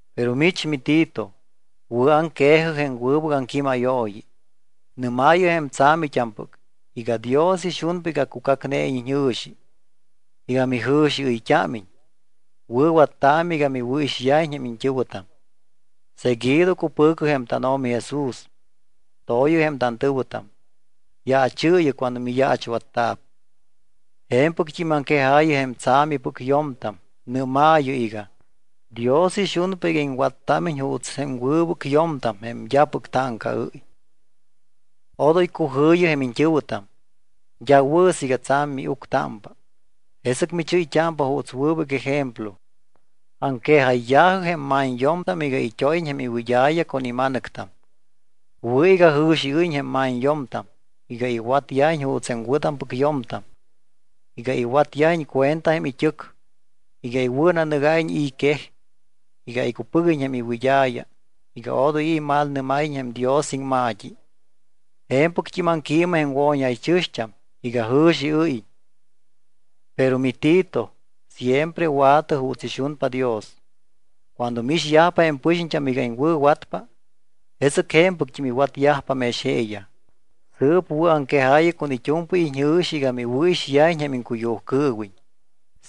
Pero mich miTito, wɨ̱aŋque̱jɨ jém wɨbɨc aŋquímayooyi. Nɨ́maayɨ jém tsa̱mit́ampɨc iga: “Dios ixunpa iga cucacneiñ iñjɨ̱xi, iga mijɨ̱xiɨyt́ámiñ. Wɨ̱wattaamɨ iga miwɨ̱ixyajiñ jém iñt́ɨ̱wɨtam. Seguido cupɨ̱cɨ jém tánO̱mi Jesús, to̱yɨ jém tantɨ̱wɨtam, yaachɨɨyɨ cuando miyaachwatta̱p.” Je̱mpɨct́im aŋquejaayɨ jém tsa̱mipɨc yo̱mtam, nɨ́maayɨ iga: “Dios ixunpa iga iŋwattámiñ juuts jém wɨbɨc yo̱mtam jém d́apɨc táŋcaɨ́y. Odoy cujɨ̱yɨ jém iñt́ɨ̱wɨtam. D́a wɨ̱ siiga tsa̱m miuctámpa. Jesɨc michɨ́yt́ámpa juuts wɨbɨc ejemplo.” Aŋquejayya̱jɨ jém ma̱ñyo̱mtam iga it́óyiñ jém iwɨd́a̱ya con ima̱nɨctam. Wɨ̱ iga jɨ̱xiɨ́yiñ jém ma̱ñyo̱mtam, iga iwatyajiñ juuts jém wɨ̱tampɨc yo̱mtam, iga iwatyajiñ cuenta jém it́ɨc, iga iwɨ̱nanɨgáyiñ i̱ quej y iga icupɨguiñ jém iwɨd́a̱ya iga odoy i̱ imalnɨ́máyiñ jém Dios iŋma̱t́i. Je̱mpɨct́im aŋquiimɨ jém wo̱ñjaychɨ̱xt́am iga jɨ̱xiɨ́yiñ. Pero miTito, siempre wa̱tɨ juuts ixunpa Dios. Cuando miixyajpa jém impɨxiñt́am iga iŋwɨ̱watpa, jesɨc je̱mpɨct́im iwatyajpa mex jeeyaj. Sɨɨp wɨ̱aŋquejaayɨ con it́u̱mpɨy iñjɨ̱xi iga miwɨ̱ixyajiñ jém iŋcuyujcɨɨwiñ.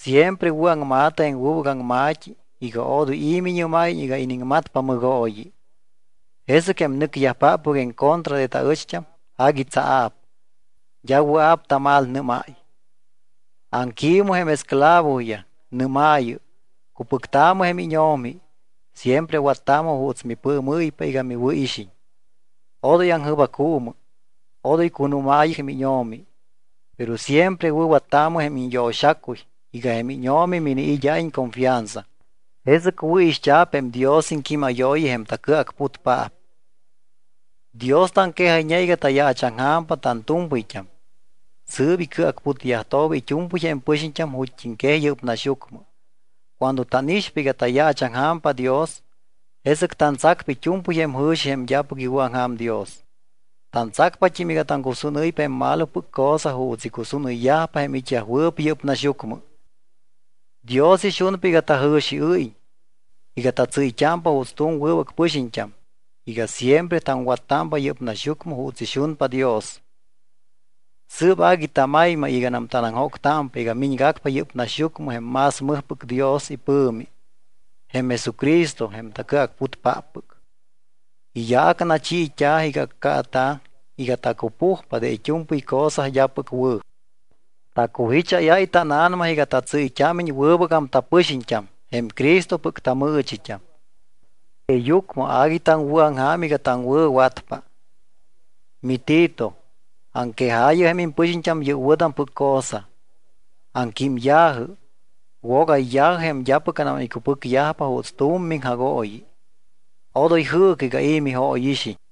Siempre wɨ̱aŋma̱tɨ jém wɨbɨc aŋma̱t́i iga odoy i̱ miñɨ́máyiñ iga iniŋmatpa mɨgooyi. Jesɨc jém nɨcyajpáppɨc en contra de taɨcht́am agui tsaa̱p. D́a wɨa̱p tamalnɨ́máy. Aŋquiimɨ jém esclavoyaj, nɨ́maayɨ: “Cupɨctaamɨ jém íño̱mi. Siempre wattaamɨ juuts mipɨɨmɨ́ypa iga miwɨ̱ixiñ. Odoy aŋjɨbaccuumɨ. Odoy cunúmaayɨ jém íño̱mi, pero siempre wɨ̱wattaamɨ jém iñyo̱xacuy iga jém íño̱mi miniid́áyiñ confianza, jesɨc wɨ̱ixt́a̱p jém Dios iŋquímayooyi, jém tacɨacputpaap.” Dios taŋquejayñe iga tayaachaŋja̱mpa tantu̱mpɨyt́am. Sɨɨp icɨacputyajtooba it́u̱mpɨy jém pɨxiñt́am ju̱t́iŋquej yɨ́p naxyucmɨ. Cuando tánixpa iga tayaachaŋja̱mpa Dios, jesɨc tantsacpa it́u̱mpɨy jém jɨ̱xi jém d́apɨc iwɨ̱aŋja̱m Dios. Tantsacpat́im iga taŋcusúnɨ́ypa jém malopɨc cosa juuts icusúnɨyyajpa jém it́yajwɨɨp yɨ́p naxyucmɨ. Dios ixunpa iga tajɨ̱xiɨ́yiñ, iga tatsɨ́yt́ámpa juuts wɨbɨc pɨxiñt́am, iga siempre taŋwattámpa yɨ́p naxyucmɨ juuts ixunpa Dios. Sɨɨp agui tamaymay iganam tanaŋjóctámpa iga miñgacpa yɨ́p naxyucmɨ jém más mɨjpɨc Dios ipɨ̱mi, jém Jesucristo jém tacɨacputpáppɨc. Iyaac nachiit́a̱ iga accaata̱ iga tacupujpa de it́u̱mpɨy cosa d́apɨc wɨ̱. Tacujicháyáy tána̱nama iga tatsɨ́yt́ámiñ wɨbɨgam tapɨxiñt́am, jém Cristopɨc tamɨɨchit́am. Jeeyucmɨ agui taŋwɨ̱aŋja̱m iga taŋwɨ̱watpa. MiTito, aŋquejaayɨ jém impɨxiñt́am yɨ́p wɨ̱tampɨc cosa. Aŋquímya̱jɨ, wogayya̱jɨ jém d́apɨcnam iwɨ̱cupɨcyajpa juuts tu̱m miŋjagooyi. Odoy jɨɨcɨ iga i̱ mijóyixiñ.